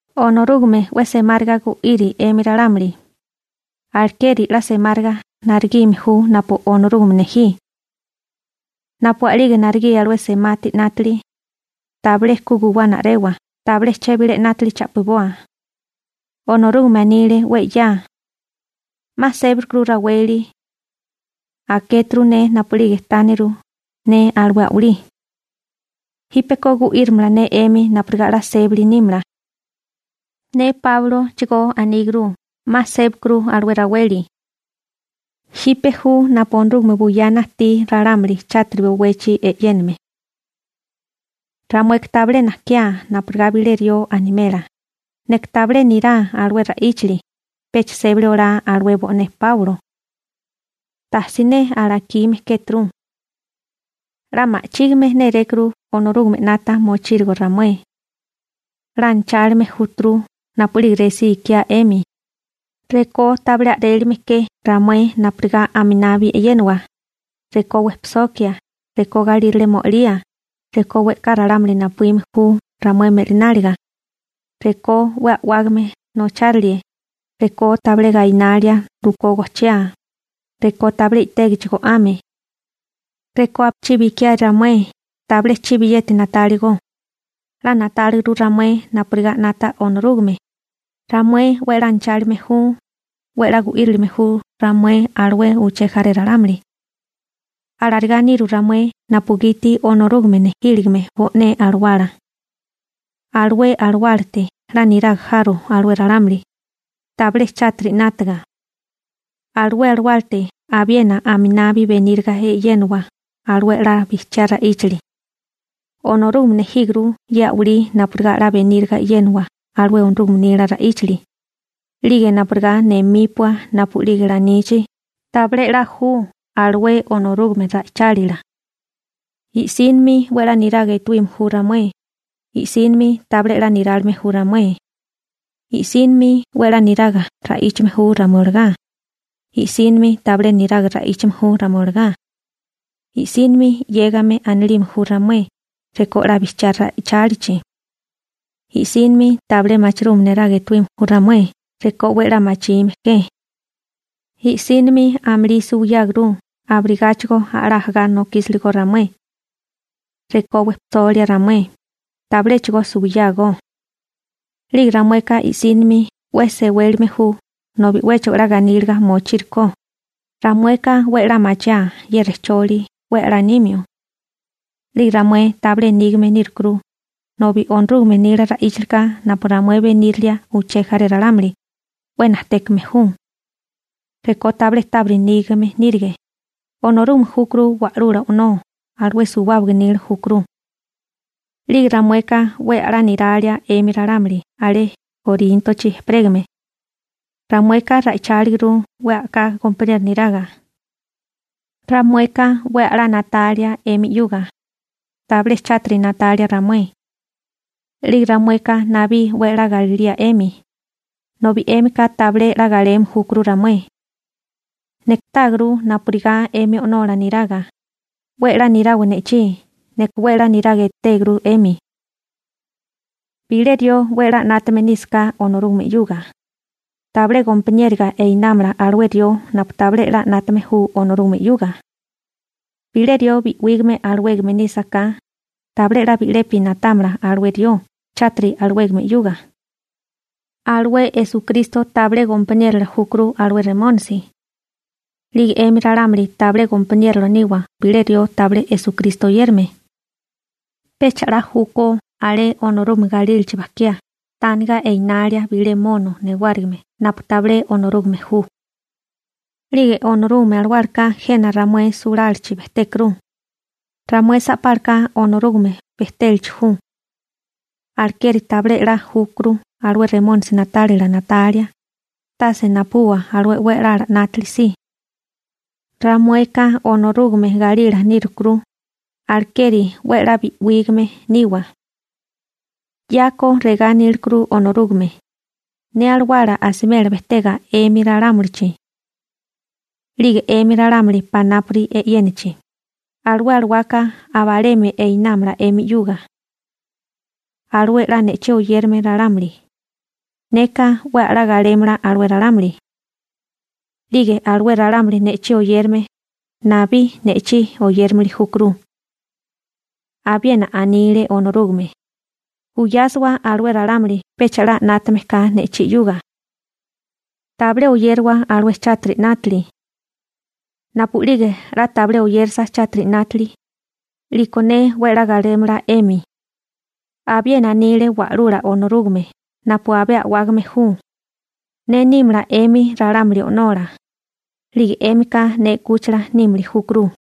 Onorúgame 'we semáriga gu'iri 'emi ralámuli, alekeri 'la semáriga naregime ju napu Onorúgame nejí. Napu a'lige naregí alué semati 'nátili, tabilé ku guwana a'rewa, tabilé chebilé 'nátili cha'piboa. Onorúgame anile 'we 'ya: 'Ma sébakuru raweli. Akéturu ne napu'lige tániru ne alué a'walí. Jípeko gu'írimala ne 'emi napurigá 'la sébali nímala. Ne Páulochigó aníguru 'ma sébakuru alué raweli. Jipe ju napu Onorúgame buyana ajtí ralámuli chátiri bowechi e'yéname. Ramueka tabilé najkiá napurigá bilé rió animela: «Neka tabilé nirá alué ra'íchali, pecha sébali olá alué bo'né Páulo.» Ta siné alakime kéturu. 'La ma'chígime nérékuru Onorúgame 'nata mochírigo ramué. 'La anachálime júturu napu'lige resí ikiá 'emi, rekó tabilé a'rélime ke ramué napurigá a'minabi e'yénawa, rekó wejpisokia, rekó galírale mo'alía, rekó we'ká ralámuli napuíme ju ramué me'lináliga, rekó 'we a'wágame nocháralie, rekó tabilé gainalia rukó gojchiá, rekó tabilé i'tégichi go'ame. Rekó napuchibi ikiae ramué tabilé chibiyeti na'táligo, 'la na'táliguru ramué napurigá 'nata Onorúgame, ramué 'we 'la anachálime ju, 'we 'la gu'írime ju ramué alué uché jaré ralámuli. Alarigá niru ramué napugiti Onorúgame nejíligime bo'né alawala. Alué alawálate 'la niraga jaro alué ralámuli, tabilé chátiri 'nátaga. Alué alawálate abiena aminabi beníriga e'yénowa alué 'la bijchiá ra'íchali. Onorúgame nejíguru ye a'walí napurigá beníriga e'yénawa alué Onorúgame nila ra'íchali, 'lige napurigá nemípua napu'lige lanichi: «Tabilé 'la ju alué Onorúgame ra'ichálila.» I'sínimi 'we 'la niraga etuime ju ramué, i'sínimi tabilé 'la nirálime ju ramué. I'sínimi 'we a'lá niraga ra'íchame ju ramué olagá, i'sínimi tabilé niraga ra'íchame ju ramué olagá. I'sínimi 'yégame anilime ju ramué rekó 'la bijchiá ra'ichálichi. I'sínimi tabilé machirume neraga etuíme ju ramué rekó 'we a'lá machime ke. I'sínimi amulí suwiyáguru, abirigáchigo a'lá ajagá nokísiligó ramué. Rekó wejpisolia ramué, tabiléchigo suwiyágó. 'Lige ramueka i'sínimi 'we sewélime ju nobi 'wéchigo 'la ganíliga mochírikó, ramueka 'we a'lá machiáa ye rejcholi 'we a'lá nimio. 'Lige ramué tabilé nígame nírukuru, nobi Onorúgame nila ra'íchalika napu ramué benírilia uché jaré ralámuli, 'we najtékame ju. Rekó tabilé tábiri nígame nírige, Onorúgame júkuru Wa'lula O'nó, alué suwábaga nila júkuru. 'Lige ramueka 'we a'lá niralia 'emi ralámuli alé Koríntochi ejperégame. Ramueka ra'icháliguru 'we a'ká gompaniero niraga. Ramueka 'we a'lá na'talia 'emi 'yuga, tabilé chátiri na'talia ramué. 'Lige ramueka nabí 'we a'lá galilía 'emi, nobi 'émika tabilé 'la galeme júkuru ramué. Neka táaguru napurigá 'emi o'nola niraga: 'We 'la nirawa ne'chí, neka 'we 'la niraga etéguru 'emi. Bilé rió 'we 'la 'nátame nísaká Onorúgame 'yuga, tabilé gompaniéroga einámala alué rió napu tabilé 'la 'nátame ju Onorúgame 'yuga. Bilé rió bi'wígame alawégame nísaká, tabilé 'la bi'lepi na'támala alué rió chátiri alawégame 'yuga. Alué Esukristo tabilé gompaniérola júkuru alué Remónisi. 'Lige 'emi ralámuli tabilé gompaniérola niwa bilé rió tabilé Esukristo oyérame. Pecha 'la júkó alé Onorúgame galílachi bajkiá tániga enalia bilé mono newárigime napu tabilé Onorúgame ju. 'Lige Onorúgame Alawálaka jena ramué sulálachi bejtékuru. Ramué sa'pálaka Onorúgame bejtélachi ju. Alekeri tabilé 'la júkuru alué Remónisi na'tálila na'talia, tase napubuwa alué 'we a'lala 'nátili si. Ramueka Onorúgame galila nírukuru, alekeri 'we 'la bi'wígame niwa. 'Yako regá anílekuru Onorúgame: Ne alawala asimela bejtega 'emi ralámulichi. 'Lige 'emi ralámuli panápuri e'yénachi, alué alawaka aba alemi einámala 'emi 'yuga. Alué 'la ne'chí oyérame ralámuli, neka 'we a'lá galémala alué ralámuli. 'Lige alué ralámuli ne'chí oyérame, nabí ne'chí oyérimili júkuru. Abiena anile Onorúgame: Buyásiwa alué ralámuli pecha 'la 'nátame ka ne'chí 'yuga. Tabilé oyérawa alué chátiri 'nátili. Napu'lige 'la tabilé oyérasa chátiri 'nátili, 'liko ne 'we 'la galémala 'emi. Abiena anile Wa'lula Onorúgame napu abé a'wágame ju: Ne nímala 'emi ralámuli o'nola, 'lige 'émika ne 'kúchila nímili júkuru.